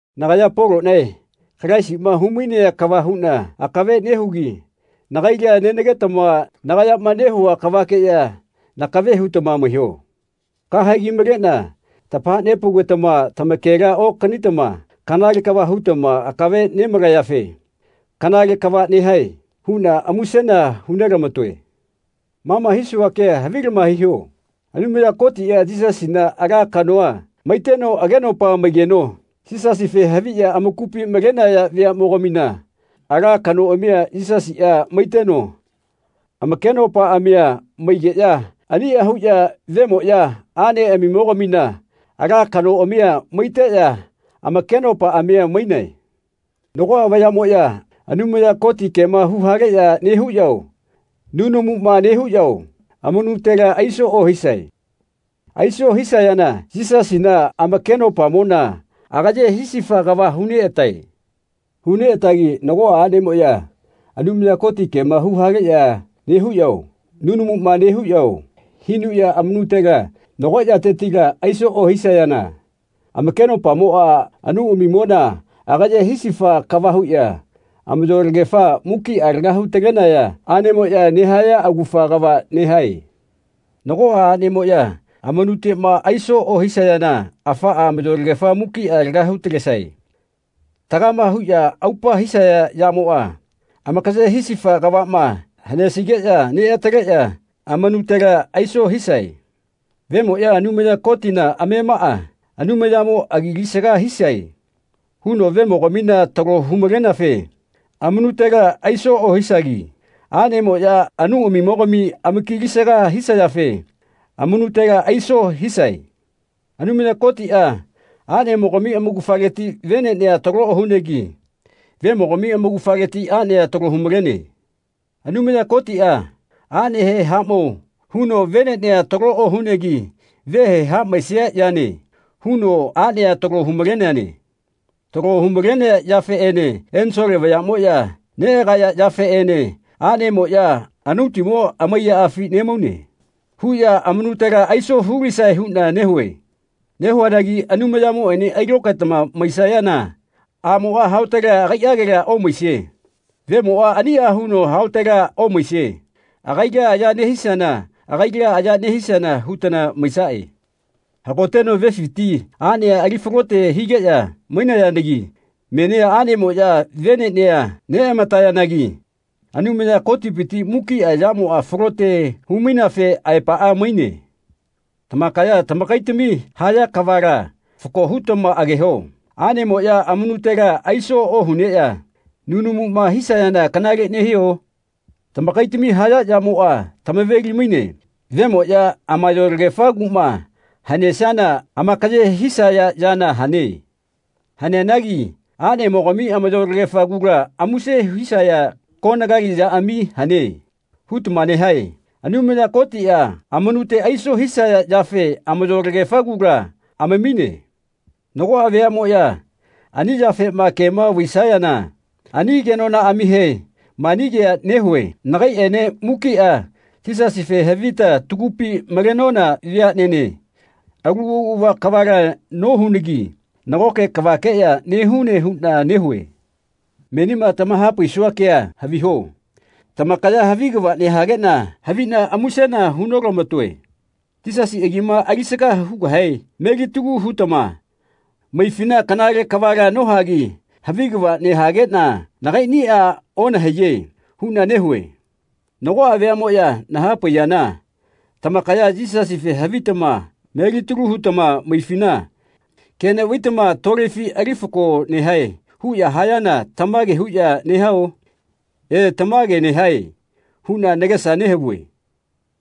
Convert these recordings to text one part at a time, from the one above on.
Nagaya Poloꞌnae Kalaisiꞌma humainea kava huꞌna akave nehugi nagaila nenagetama nagayama nehua kavakeꞌya nakave hutama maiho. Kahegi maleꞌna tamahapaugetama tamakela okanitama kanale kava hutama akave nemalayafe “Kanale kava nehae.” huꞌna musena hu nelamatoe. Ma ma hisua kea havilama hiho. Anumaya Kotiꞌa Yisasina ala kanoꞌa maiteno agenopa maigeno Yisasife haviꞌya amakupi malenaya veaꞌmogamina ala kanoꞌamia Yisasiꞌa maiteno amakenopaꞌamia maigeꞌya aniꞌa huꞌya vemoꞌya aꞌneꞌamimogamina ala kanoꞌamia maiteꞌya amakenopaꞌamia mainae. Nagoꞌa vayaꞌmoꞌya Anumaya Koti kema huhaleꞌya nehuꞌyao nunamuma nehuꞌyao amanutela aiso ohisae. Aiso hisayana Yisasina, amakenopamona agaye hisifa kava huneꞌatae. Huneꞌatagi nagoꞌa aꞌnemoꞌya Anumaya Koti kema huhaleꞌya nehuꞌyao nunamuma nehuꞌyao hinuꞌya amanutela nago yatetila aiso ohisayana amakenopamoꞌa, anauꞌamimona agaye hisifa kava huꞌya amayolagefa mukiꞌa laga hu-talenaya aꞌnemoꞌya nehaya augafa kava nehae. Nagoꞌa aꞌnemoꞌya amanuteꞌma aiso ohisayana afaꞌa amayolagefa mukiꞌa laga hu-talesae. Tagama huꞌya aupa hisaya yamoꞌa amakaye hisifa kavaꞌma hanesigeꞌya neꞌataleꞌya amanutela aiso hisae. Vemoꞌya Anumaya Kotina amemaꞌa “Anumayamo agi alisaga hisae.” huno vemogamina talo hu-maleneafe amanutela aiso ohisagi aꞌnemoꞌya anauꞌamimogami amaki alisaga hisayafe amanutela aiso hisae. Anumaya Kotiꞌa aꞌnemogami amaugafaleti veneꞌnea talo ohunegi vemogami amaugafaleti aꞌnea talo humalene. Anumaya Kotiꞌa aꞌnehe “Haꞌmao.” huno veneꞌnea talo ohunegi vehe “Haꞌmaesia yane.” huno aꞌnea talo hu-maleneane. Talo hu-malenea yafeꞌene ensole vayaꞌmoꞌya neꞌagaya yafeꞌene aꞌnemoꞌya “Anautimo amaiyaꞌafi nemaune.” huꞌya amanutela aiso hulisae huꞌna nehue. Nehuanagi Anumayamoꞌene ailokaetama maisayana aꞌmoꞌa haotela agaiꞌagela omaisie. Vemoꞌa aniꞌa huno haotela omaisie. Agaila aya nehisiana agaila aya nehisiana hutana maisaꞌe. Hagoteno vefiti aꞌnea ali falote higeꞌya mainayanagi menia aꞌnemoꞌya veneꞌnea neꞌamatayanagi Anumaya Kotipiti mukiꞌa yamoꞌa falote hu-maineafe aepaꞌa maine. Tamakaya tamakaitami haya kavala fako hutama ageho. Aꞌnemoꞌya amanutela aiso ohuneꞌya nunamuma hisayana kanale nehio? Tamakaitami haya yamoꞌa tamaveli-maine vemoꞌya amayolagefa kuꞌma hanesiana amakaye hisaya yana hane. Haneanagi “Aꞌnemogami amayolagefa kula muse hisaya konagali yaꞌami hane.” hutama nehae. Anumaya Kotiꞌa amanute aiso hisaya yafe amayolagefa kula amamine. Nagoꞌa veaꞌmoꞌya ani yafema kema vaisayana ani kenonaꞌamihe mani kea nehue nagaiꞌene mukiꞌa Yisasife havita tagupi malenona veaꞌnene alu auꞌava kavala nohunagi nagoke kavakeꞌya nehune huꞌna nehue. Menima tamahapaisua kea haviho tamakaya havi kava nehageꞌna haviꞌna musena hu notamatoe. Yisasi agima alisaga hugahe melitalu hutama maifina kanale kavala nohagi havi kava nehageꞌna nagaiꞌnia onahaiye huꞌna nehue. Nagoꞌa veaꞌmoꞌya nahapaiyana tamakaya Yisasife havitama melitalu hutama maifina ke neꞌvaitama tolefi ali fako nehae huꞌya hayana tamage huꞌya nehao? E, tamage nehae huꞌna nagesa nehavue.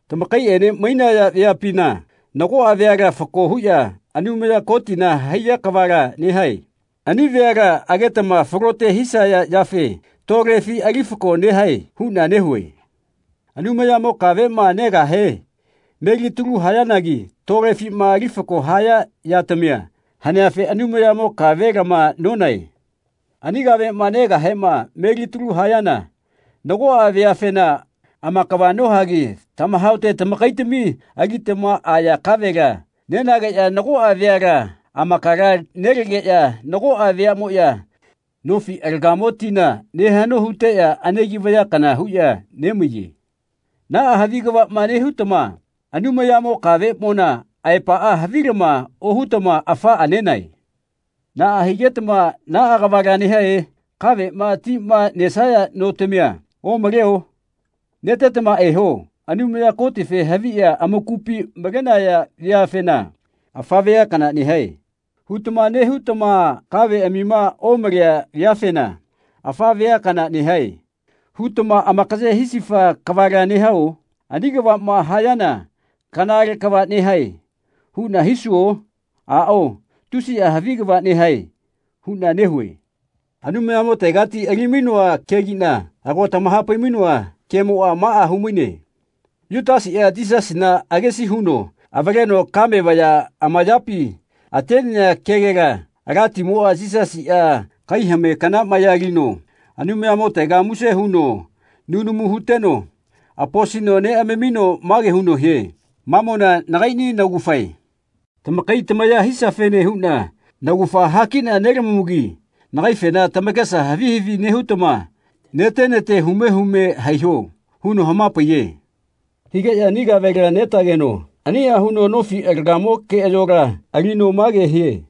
Tamakaiꞌene mainaya veapina nagoꞌa veala fatago huꞌya Anumaya Kotina haiya kavala nehae. Ani veala agetama falote hisaya yafe tolefi ali fako nehae huꞌna nehue. Anumayamo kaveꞌma negahe melitalu hayanagi tolefima ali fako haya yatamia haneafe Anumayamo kave lama nonae. Ani kaveꞌma negahema melitalu hayana nagoꞌa veafena amakava nohagi tamahaote tamakaitami alitama aya kavela nenageꞌya nagoꞌa veala amakala nelegeꞌya nagoꞌa veaꞌmoꞌya nofi alagamo tina ne haꞌno huteꞌya anegi vaya kana huꞌya nemaiye. Naꞌa havi kava nehutama Anumayamo kaveꞌmona aepaꞌa havilama ohutama afaꞌa nenae. Naꞌa higetama naꞌa kavala nehae? Kaveꞌma lima nesaya notamia omaleo? Netetama eho. Anumaya Kotife haviꞌya amakupi malenaya veafena “Afa vea kana nehae.” hutama nehutama kaveꞌamima omalea veafena “Afa vea kana nehae.” hutama amakaye hisifa kavala nehao? Ani kavaꞌma hayana “Kanale kava nehae.” huꞌna hisuo? Aꞌao “Tusiꞌa havi kava nehae.” huꞌna nehue. Anumayamotegati ali-mainoa kegiꞌna ago tamahapai-mainoa kemoꞌa maꞌa humaine Yutasiꞌa Yisasina agesi huno avaleno kame vaya amayapi atenea kegela Alatimoꞌa Yisasiꞌa kai hame kana maya alino Anumayamotega muse huno nunamu huteno aposino neꞌamamino mage huno hie “Mamona nagaiꞌni naugafae. Tamakai tamaya hisiafene huꞌna naugafa hakiꞌna nelamamugi nagaifena tamakesa havi havi nehutama nete nete hume hume haiho.” huno hamapaiye. Higeꞌya ani kavela netageno aniꞌa huno nofi alagamo keꞌayola alino mage hie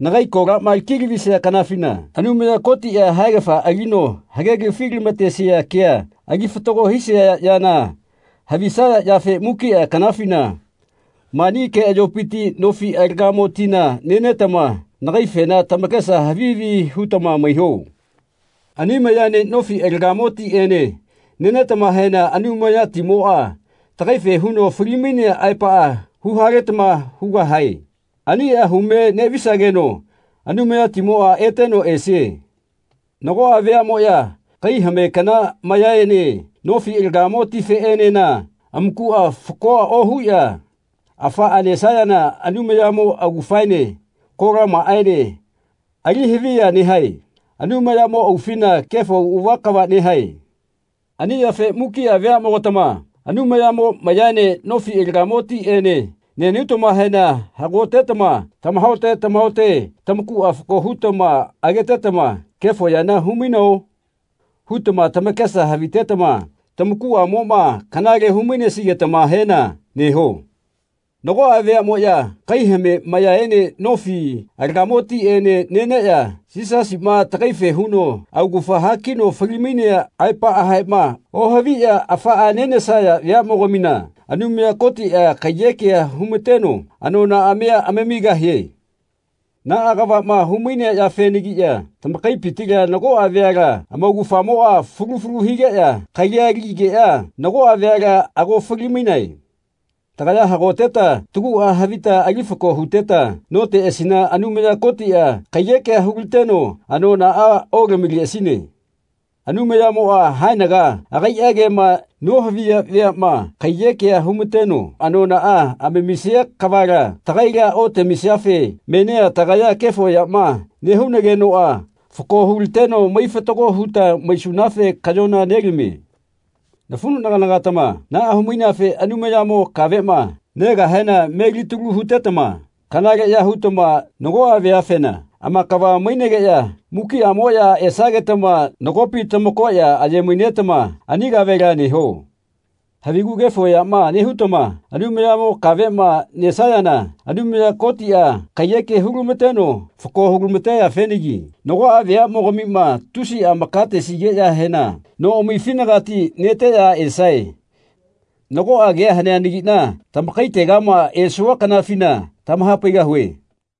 “Nagai kolama laki lavisia kanafina Anumaya Kotiꞌa haegafa alino hagelafi lamatesia kea ali fatago hisia yana havisaya yafe mukiꞌa kanafina mani keꞌayopiti nofi alagamo tina nenetama nagaifena tamakesa havi havi hutama maiho. Ani mayaene nofi alagamo tiꞌene nenetamahena Anumayatimoꞌa tagaife huno fali-mainea aepaꞌa huhaletama hugahae. Aniꞌa hume neꞌvisageno Anumayatimoꞌa eteno esie.” Nagoꞌa veaꞌmoꞌya kai hame kana mayaene nofi alagamo tifeꞌenena amakuꞌa fakoa ohuꞌya afaꞌa nesayana Anumayamo augafaene kolamaꞌaene alihaviya nehae. Anumayamo aufina kefo auꞌava kava nehae. Ani yafe mukiꞌa veaꞌmogatama Anumayamo mayaene nofi alagamo tiꞌene nenutamahena hagotetama tamahaote tamahaote tamakuꞌa fako hutama agetetama “Kefo yana humaino?” hutama tamakesa havitetama tamakuꞌamoꞌma kanale hu-mainesigetamahena neho. Nagoꞌa veaꞌmoꞌya kai hame mayaene nofi alagamo tiꞌene neneꞌya Yisasiꞌma tagaife huno augafa hakino fali-mainea aepaꞌahema ohaviꞌya afaꞌa nenesaya veaꞌmogamina Anumaya Kotiꞌa kaiyekea humateno anonaꞌamia amamigahie. Naꞌa kavaꞌma humainea yafenagiꞌya tamakaipitila nagoꞌa veala amaugafamoꞌa fulu fulu higeꞌya kalia aligeꞌya nagoꞌa veala ago fali-mainae. Tagaya hagoteta taguꞌa havita ali fako huteta noteꞌasina Anumaya Kotiꞌa kaiyekea hulateno anonaꞌa otamileꞌasine. Anumayamoꞌa haenaga agai kema nohaviya veaꞌma kaiyekea humateno anonaꞌa amamisia kavala tagaila otamisiafe menia tagaya kefo yama nehunagenoꞌa fako hulateno mai fatago huta maisunafe kaꞌyona nelamie. Nafuꞌnagana-gatama naꞌa humaineafe Anumayamo kaveꞌma negahena melitalu hutetama kanaleꞌya hutama nagoꞌa veafena amakava mainegeꞌya mukiꞌamoꞌya esagetama nagopi tamakoꞌya aye-mainetama ani kavela neho. Havigu kefo yama nehutama Anumayamo kaveꞌma nesayana Anumaya Kotiꞌa kaiyeke hulamateno fako hulamateyafenagi nagoꞌa veaꞌmogamima tusiꞌa amakatesigeꞌyahena noꞌamifinagati neteꞌya esae. Nagoꞌa kea haneanagiꞌna tamakaitegama esua kanafina tamahapaigahue.